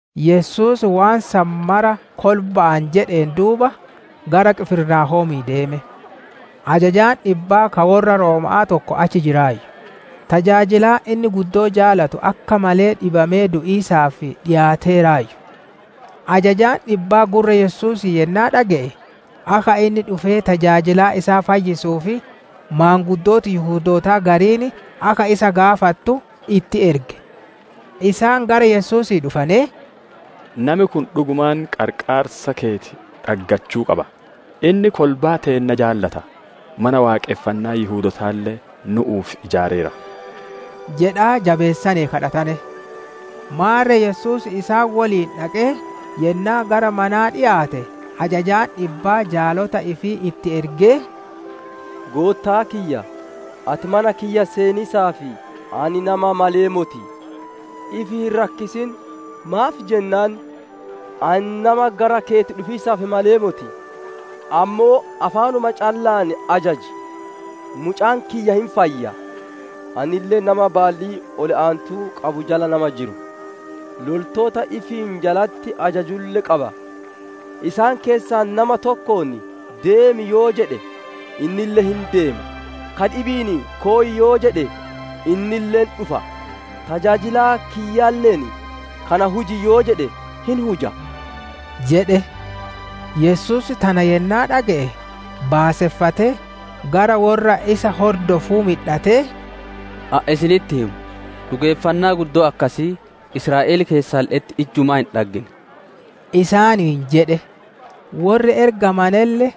Yesuus waan san mara kolba'aan jedheen duuba, gara Qifirnaahoomii deeme. Ajajaan dhibbaa ka worra Rooma'aa tokko achi jiraayyu; tajaajilaan inni guddoo jaalatu akka malee dhibamee du'iisaaf dhikaateeraayyu. Ajajaan dhibbaa gurra Yesuusii yennaa dhage'e, akka inni dhufee tajaajilaa isaa fayyisuuf maanguddooti Yihudootaa gariin akka isa gaafattu itti erge. Isaan gara Yesuusii dhufanee, «Nami kun dhugumaan qarqaarsa keeti dhaggachuu qaba. Inni kolbaa teenna jaalata, Mana Waaqonfannaa Yihudootaalle nu'uuf ijaareera» jedhaa jabeessanee kadhatane. Maarre Yesuus isaan woliin dhaqee, Yennaa gara manaa dhikaate ajajaan dhibbaa jaalota ifii itti ergee, «Goottaa kiyya, ati mana kiyya seeniisaaf ani nama malee moti! Ifi hin rakkisin; maaf jennaan, ani nama gara keeti dhufiisaaf malee moti. Ammoo afaanuma calla'aan ajaji, mucaan kiyya hin fayya. Anille nama baallii ol aantuu qabu jala nama jiru, loltoota ifiin jalatti ajajulle qaba. Isaan keessaa nama tokkoon, ‹Deemi› yoo jedhe, innille hin deema; ka dhibi'iin ‹Koy› yoo jedhe, innille hin dhufa; tajaajilaa kiyyalle'een, ‹Kana huji› yoo jedhe hin huja» jedhe. Yesuus tana yennaa dhage'e baaseffatee gara worra isa hordofuu midhatee, «Ani isinitti hima, dhugeeffannaa guddoo akkasii Israa'el keessalle'etti ijjumaa hin dhaggine» isaaniin jedhe. Worri ergamanelle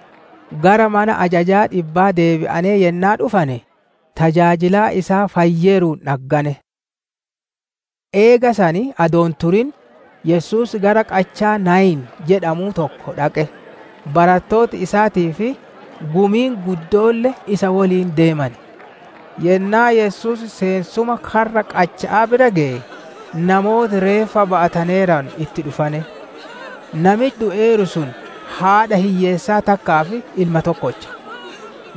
gara mana ajajaa dhibbaa deebi'anee yennaa dhufane tajaajilaan isaa fayyeeruun dhaggane. Eega san adoo hin turin, Yesuus gara qachaa Naayin jedhamuu tokko dhaqe; barattooti isaatii fi gumiin guddoolle isa woliin deemane. Yennaa Yesuus seensuma karra qacha'aa bira geye, namooti reeffa ba'ataneeranu itti dhufane. Nami du'eeru sun haadha hiyyeessaa takkaaf ilma tokkocha.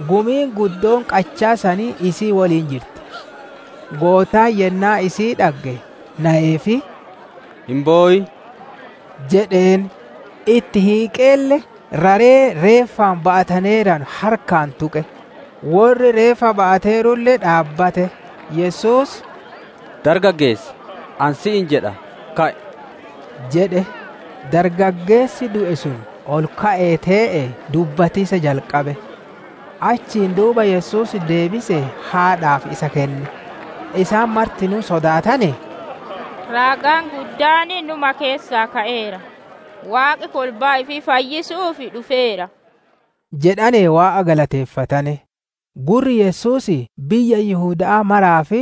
Gumiin guddoon qachaa sanii isii woliin jirti. Goottaan yennaa isii dhagge, nayeefii, «Hin bowin» jedheen. Itti hiiqeelle raree reeffaan ba'ataneeranu harkaan tuqe. Worri reeffa ba'ateerulle dhaabbate; Yesuus, «Dargaggeessa! Ani si'iin jedha ka'i!» jedhe. Dargaggeessi du'e sun ol ka'ee tee'ee dubbatiisa jalqabe. Achiin duuba Yesuus deebisee haadhaaf isa kenne. Isaan martinuu sodaatanee, «Raagaan guddaan nu'uma keessaa ka'eera; Waaqi kolbaa ifii fayyisu'uuf dhufeera» jedhanee Waaqa galateeffatane. Gurri Yesuusii biyya Yihuda'aa maraa fi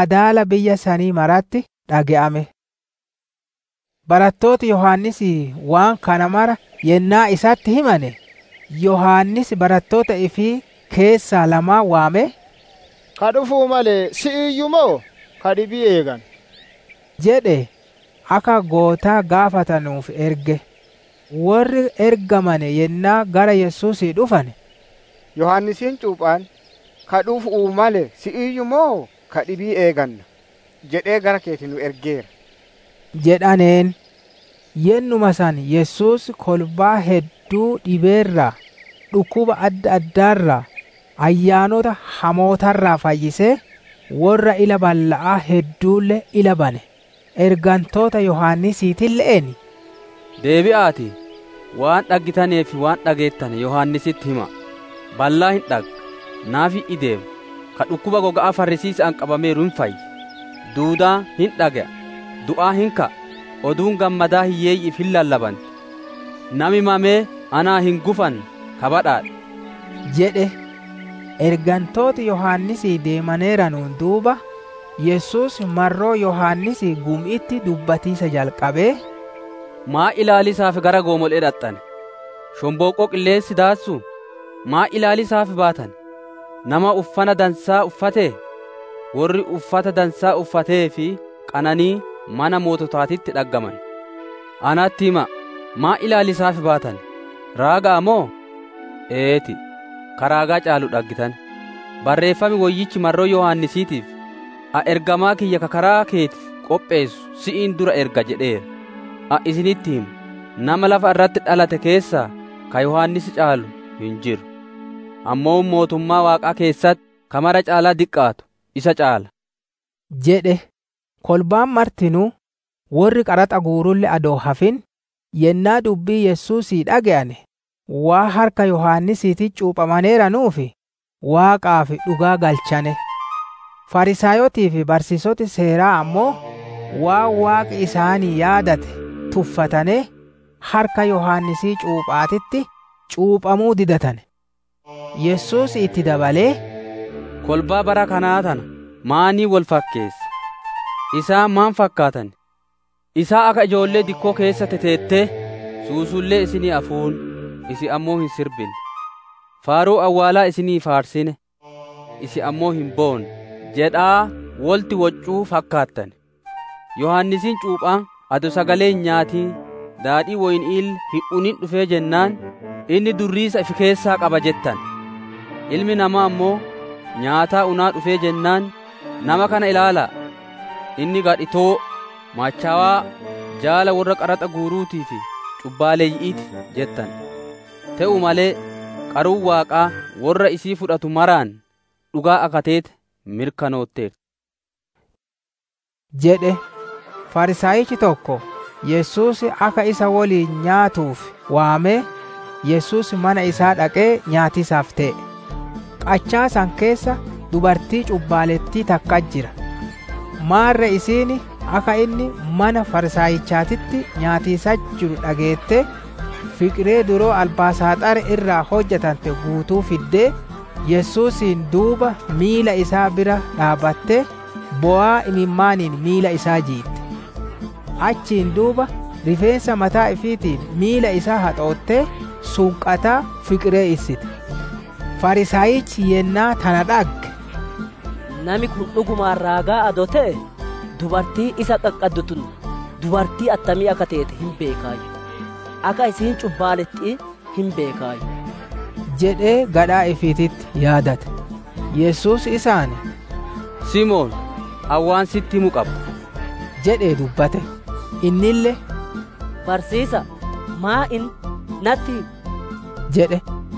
adaala biyya sanii maratti dhage'ame. Barattooti Yohaannisii waan kana mara yennaa isatti himane, Yohaannis barattoota ifii keessaa lamaan waamee, «Ka dhufu'uu male si'iiyyu moo ka dhibii eeganna?» jedhee, akka Goottaa gaafatanuuf erge. Worri ergamane yennaa gara Yesuusii dhufane, «Yohaannisiin cuuphaan, ‹Ka dhufu'uu male si'iiyyu moo ka dhibii eeganna?› jedhee gara keeti nu ergeera» jedhaneen. Yennuma san Yesuus kolbaa hedduu dhibee irraa, dhukkuba adda addaa irraa, ayyaanota hamoota irraa fayyisee, worra ila balla'aa hedduulle ila bane. Ergantoota Yohaannisiitille'een, «Deebi'aatii, waan dhaggitanee fi waan dhageettane Yohaannisitti hima'a! Ballaan hin dhagga, naafi hin ideema, ka dhukkuba goga'aa farrisiisa'aan qabameeru hin fayya, duudaan hin dhage'a, du'aan hin ka'a, Oduun Gammadaa hiyyeeyyi'iif hin lallabanti. Nami mamee anaan hin gufanne ka badhaadhe!» jedhe. Ergantooti Yohaannisii deemaneeranuun duuba, Yesuus marroo Yohaannisii gumi'itti dubbatiisa jalqabee: «Maan ilaaliisaaf gara goomole'ee dhaxxane? Shonbooqqoo qilleensi daassuu? Maan ilaaliisaaf baatane? Nama uffana dansaa uffatee? Worri uffata dansaa uffatee fi qananiin mana moototaatitti dhaggaman. Natti hima'a, maan ilaaliisaaf baatane? Raaga'a moo? Eeti, ka Raagaa caalu dhaggitane. Barreeffam Woyyichi marroo Yohaannisiitiif, ‹Ani ergamaa kiyya ka karaa keeti qopheessu si'iin dura erga› jedheera. Ani isinitti hima, nama lafa irratti dhalate keessaa, ka Yohaannis caalu hin jiru. Ammoo mootummaa Waaqaa keessatti ka mara caalaa diqqaatu isa caala» jedhe. Kolbaan martinuu, worri qaraxa guurulle adoo hin hafin, yennaa dubbii Yesuusii dhage'ane, waan harka Yohaannisiititti cuuphamaneeranuuf, Waaqaaf dhugaa galchane. Fariisaayotii fi barsiisoti Seeraa ammoo, waan Waaqi isaanii yaadate tuffatanee, harka Yohaannisii cuupha'aatitti cuuphamuu didatane. Yesuus itti dabalee, «Kolbaa bara kanaa tana maaniin wol fakkeessa? Isaan maan fakkaatan? Isaan akka ijoollee dikkoo keessa teteettee, ‹Suusullee isinii afuunne, isin ammoo hin sirbine; faaruu awwaalaa isinii faarsine; isin ammoo hin boonne› jedhaa wolitti woccu fakkaatan. Yohaannisiin cuuphaan adoo sagalee hin nyaatin, daadhii woyni'iille hin unin dhufee jennaan, ‹Inni durriisa ifi keessaa qaba› jettane. Ilmi Namaa ammoo, nyaataa unaa dhufee jennaan, ‹Nama kana ilaala'a! Inni gadhitoo, machowaa, jaala worra qaraxa guuruutii fi cubbaaleyyi'ii ti› jettane. Te'uu malee, qaruun Waaqaa worra isii fudhatu maraan dhugaa akka teete mirkanootteerti» jedhe. Fariisaayichi tokko Yesuus akka isa woliin nyaatuuf waamee, Yesuus mana isaa dhaqee nyaatiisaaf tee'e. Qachaa san keessa dubartii cubbaalettii takkatti jira. Maarre isiin akka inni mana Fariisaayichaatitti nyaatiisatti jiru dhageettee, fiqiree duloo albaasaaxarii irraa hojjatante guutuu fiddee, Yesuusiin duuba miila isaa bira dhaabbattee, bowaa imimmaaniin miila isaa jiitte. Achiin duuba rifeensa mataa ifiitiin miila isaa haxoottee, sunqataa fiqiree issite. Fariisaayichi yennaa tana dhagge, «Nami kun dhugumaan raagaa adoo te'ee, dubartiin isa qaqqaddu tun dubartii attamii akka teete hin beekaayyu; akka isiin cubbaaletti'ii hin beekaayyu» jedhee gadhaa ifiititti yaadate. Yesuus isaan, «Simoon, ani waan si'itti himu qaba» jedhee dubbate. Innille «Barsiisa'a, Maan inni? Natti himi!» jedhe.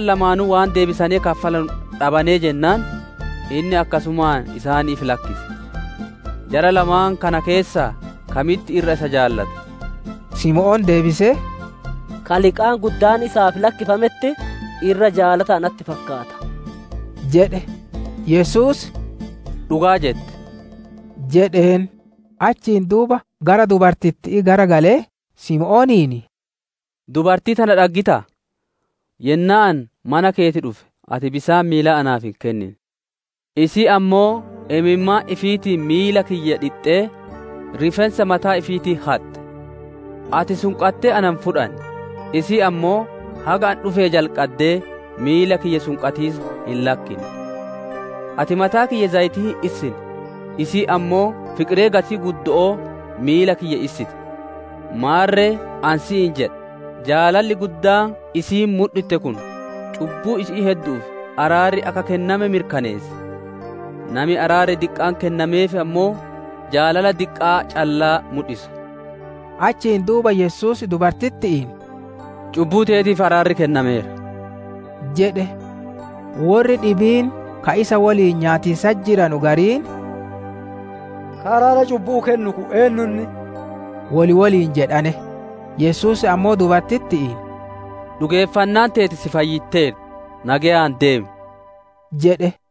Isaan lamaanuu waan deebisanee kaffalanu dhabanee jennaan, inni akkasumaan isaaniif lakkise. Jara lamaan tana keessaa kamitti irra isa jaalata? Simoon deebisee, «Ka liqaan guddaan isaa lakkifametti irra jaalata natti fakkaata» jedhe. Yesuus, «Dhugaa jette» jedheen. Achiin duuba gara dubartitti'ii garagalee, Simooniin, «Dubartii tana dhaggitaa? Yennaa ani mana keeti dhufe ati bisaan miilaa naaf hin kennine. Isiin ammoo imimmaan ifiitiin miila kiyya dhixxee, rifeensa mataa ifiitiin haxxe. Ati sunqattee na hin fudhanne, isiin ammoo haga ani dhufee jalqaddee miila kiyya sunqatiisa hin lakkinne. Ati mataa kiyya zayitii hin issine, isiin ammoo fiqiree gatii guddo'oo miila kiyya issite. Maarre, ani si'iin jedha, jaalalli guddaan isiin mudhitte kun, cubbuu isi'ii heddu'uuf araarri akka kenname mirkaneessa. Nami araarri diqqaan kennameef ammoo, jaalala diqqaa callaa mudhisa» jedhe. Achiin duuba Yesuus dubartitti'iin «Cubbuu teetiif araarri kennameera» jedhe. Worri dhibiin ka isa woliin nyaatiisatti jiranu gariin, «Ka araara cubbu'uu kennu kun, eennu inni?» wol woliin jedhane. Yesuus ammoo dubartitti'iin, «Dhugeeffannaan teeti si fayyitteerti; nageyaan deemi» jedhe.